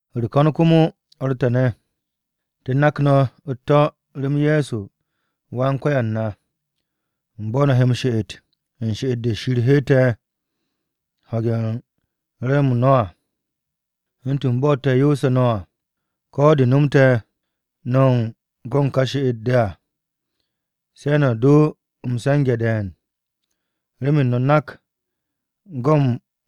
U̱r-ko̱m komo, o̱r te̱ ne̱, te̱ nak no̱ u̱t-to̱ rem Ye̱so Wan-Ko̱yan na u̱n bo̱ no̱ he m-she'et u̱n she'et-de Shir hette̱ ho̱ge̱ u̱n re̱re̱m-m no̱ à, u̱ntu̱n bo̱ te̱ yoosu̱ no̱ à. Ko̱ de̱ nomte̱ no̱ u̱n go̱ u̱n ka she'et-de à, se̱ no̱ do m-se̱nge̱ de̱e̱n. Remen no̱ nak go̱ u̱n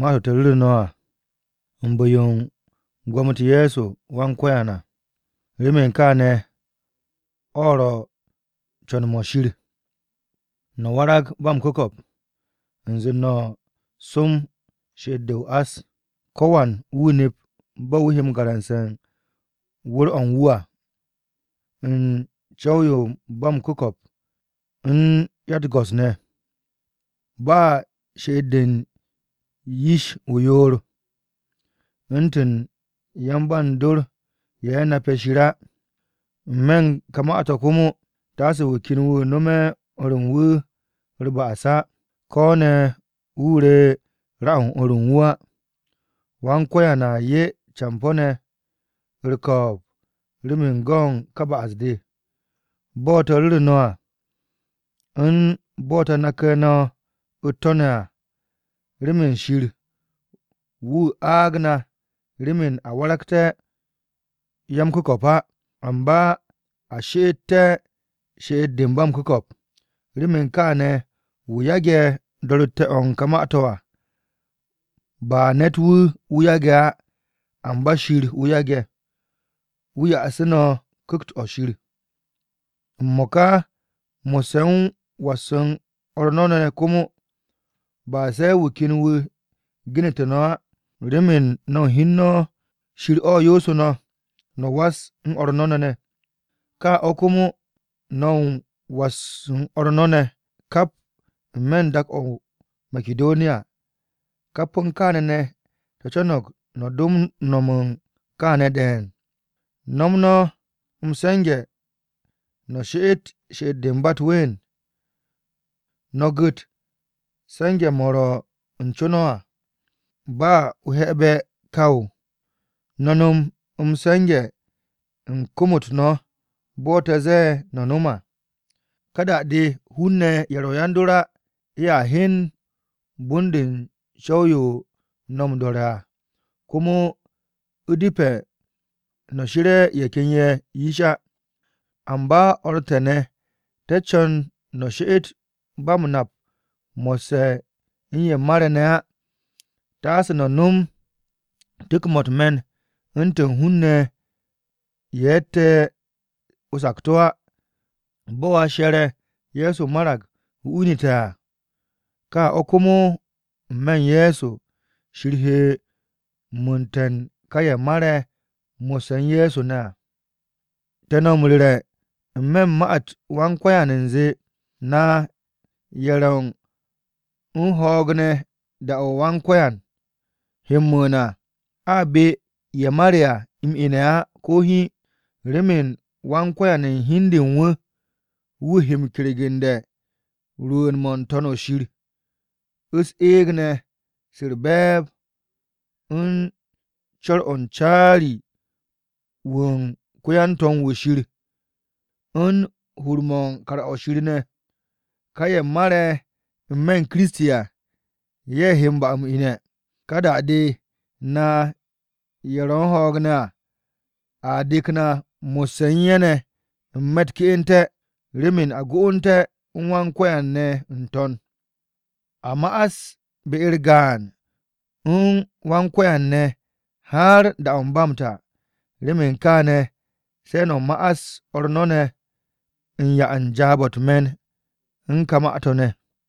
ma-to̱ te̱ ru̱re̱ no̱, u̱n bu̱-yo u̱n gwo̱mo-u̱t Ye̱so Wan-Ko̱yan à. Remen kaane̱, o̱ ro̱ co̱n-mo̱ Shir, no̱ warag ba m-ku̱ko̱p, u̱nze no̱ som she'et-de o-ás. Ko̱wan wu̱ nep bo̱ wu̱ he garamse̱ u̱n wu̱r-o̱ u̱n wu̱ à, u̱n co̱w-yo ba m-ku̱ko̱p u̱n 'ya u̱t-go̱s ne̱. Ba she'et-de u̱n yish-ye̱ o-yoor, u̱ntu̱n yan-ba u̱n dor ye̱ nape̱ Shir á. N-me̱ u̱n ka ma-to̱ komo, taase wu̱ ken wu̱ nome̱ o̱r u̱n wu̱ u̱r-ba'as á. Ko̱ ne̱ wu̱ re ra-o o̱r u̱n wu̱ á. Wan-Ko̱yan a 'ye campo̱-ne̱ u̱n ne'a-ne̱ ne̱ u̱r-ko̱o̱b remen go̱ u̱n ka ba'as-de, bo̱ te̱ ru̱re̱ no̱ à u̱n bo̱ te̱ nake̱ no̱ u̱t-to̱ ne̱ à. Remen Shir wu̱ aag na remen a waragté̱ ya-m-ku̱ko̱p á, amba a she'ete̱ she'et-de ba m-ku̱ko̱p. Remen kaane̱, wu̱ yage̱ do̱ru̱te̱ o̱ u̱n ka ma-to̱ à, ba ne̱t-wu̱ wu̱ yage̱ á, amba Shir wu̱ yage̱, wu̱ ya'asu̱ no̱ Ku̱kt-o̱ Shir. M-mo̱ka mo̱sse̱ u̱n was u̱n o̱r no̱ ne̱ ne̱ komo, ba se̱ wu̱ ken wu̱ genete̱ no̱ á, remen no̱ u̱n hi u̱n no̱ Shir o̱ yoosu̱ no̱, no̱ was u̱n o̱r no̱ ne̱ ne̱. Ka o̱ komo, no̱ u̱n was u̱n o̱r no̱ ne̱ ne̱ kap n-me̱ u̱n dak-o̱ o-Makidoniya. Kap u̱n kaane̱ ne̱, te̱ co̱no̱g no̱ do m-no̱m u̱n kaane̱ de̱e̱n. No̱m no̱ m-se̱nge̱ no̱ she'et she'et-de ba u̱t-ween, no̱ gu̱t se̱nge̱-mo̱ ro̱ u̱n co no̱ à ba o-he̱be̱ gwu̱w. No̱ no̱m m-se̱nge̱ u̱n kom-u̱t no̱ bo̱ te̱ ze̱e̱ no̱ no̱ no̱m à. Ká da-de hun-ne̱ ye̱ ro̱ yan-dor á ye̱ a hyen bon-de u̱n co̱w-yo no̱ m-do̱re̱ à, komo u̱depe̱ no̱ she̱re̱ ye̱ ken ye̱ yish á. Amba o̱r te̱ ne̱, te̱ co̱n no̱ she'et ba m-nap mo̱sse̱ u̱n ye̱ mare̱ ne̱ á, taase no̱ no̱m tu̱k-mo̱ u̱t-me̱n u̱ntu̱n hun-ne̱ ye̱ ro̱tte̱ o-sakto̱ á. Bo̱ a she̱re̱ Ye̱so marag, wu̱ inu̱te̱ à, ka o̱ komo n-me̱ u̱n Ye̱so, Shir he mu̱u̱nte̱ ka ye̱ mare̱ mo̱sse̱ u̱n Ye̱so ne̱ à. Te̱ no̱ m-ru̱re̱ n-me̱ u̱n ma-u̱t Wan-Ko̱yan u̱nze, na ye̱ ro̱ u̱n ho̱o̱g ne̱ da-o̱ Wan-Ko̱yan he m-mu̱u̱n à, a be ye̱ mare̱ à m-ine̱ á, ko̱ hiin. Remen Wan-Ko̱yan u̱n hi u̱n de u̱n wu̱, wu̱ he m-kergu̱nde̱ rwu̱u̱n-mo̱ n-To̱n shir, u̱s-eeg ne̱ se u̱r-be̱e̱b, u̱n co̱r-o̱ u̱n caari-wu̱ u̱n ko-yan-to̱m-wu̱ Shir ne̱, u̱n hur-mo̱ u̱n kar-o̱ Shir ne̱. Ka ye̱ mare̱ n-me̱ u̱n Kiristi à, ye̱ he m-ba m-ine̱. Ka da-de, na ye̱ ro̱ u̱n ho̱o̱g ne̱ à, a dek na mo̱sse̱ u̱n ye̱ ne̱ n-me̱ u̱t-ke'ente̱, remen a go'onu̱té̱ u̱n Wan-Ko̱yan ne̱ n-To̱n. A ma'as be-u̱r gaan u̱n Wan-Ko̱yan ne̱ har da-o̱ ba m-ta. Remen kaane̱, se̱ no̱ ma'as o̱r no̱ ne̱ u̱n 'ya u̱n jaab-o̱ u̱t-me̱n u̱n kà ma-to̱ ne̱.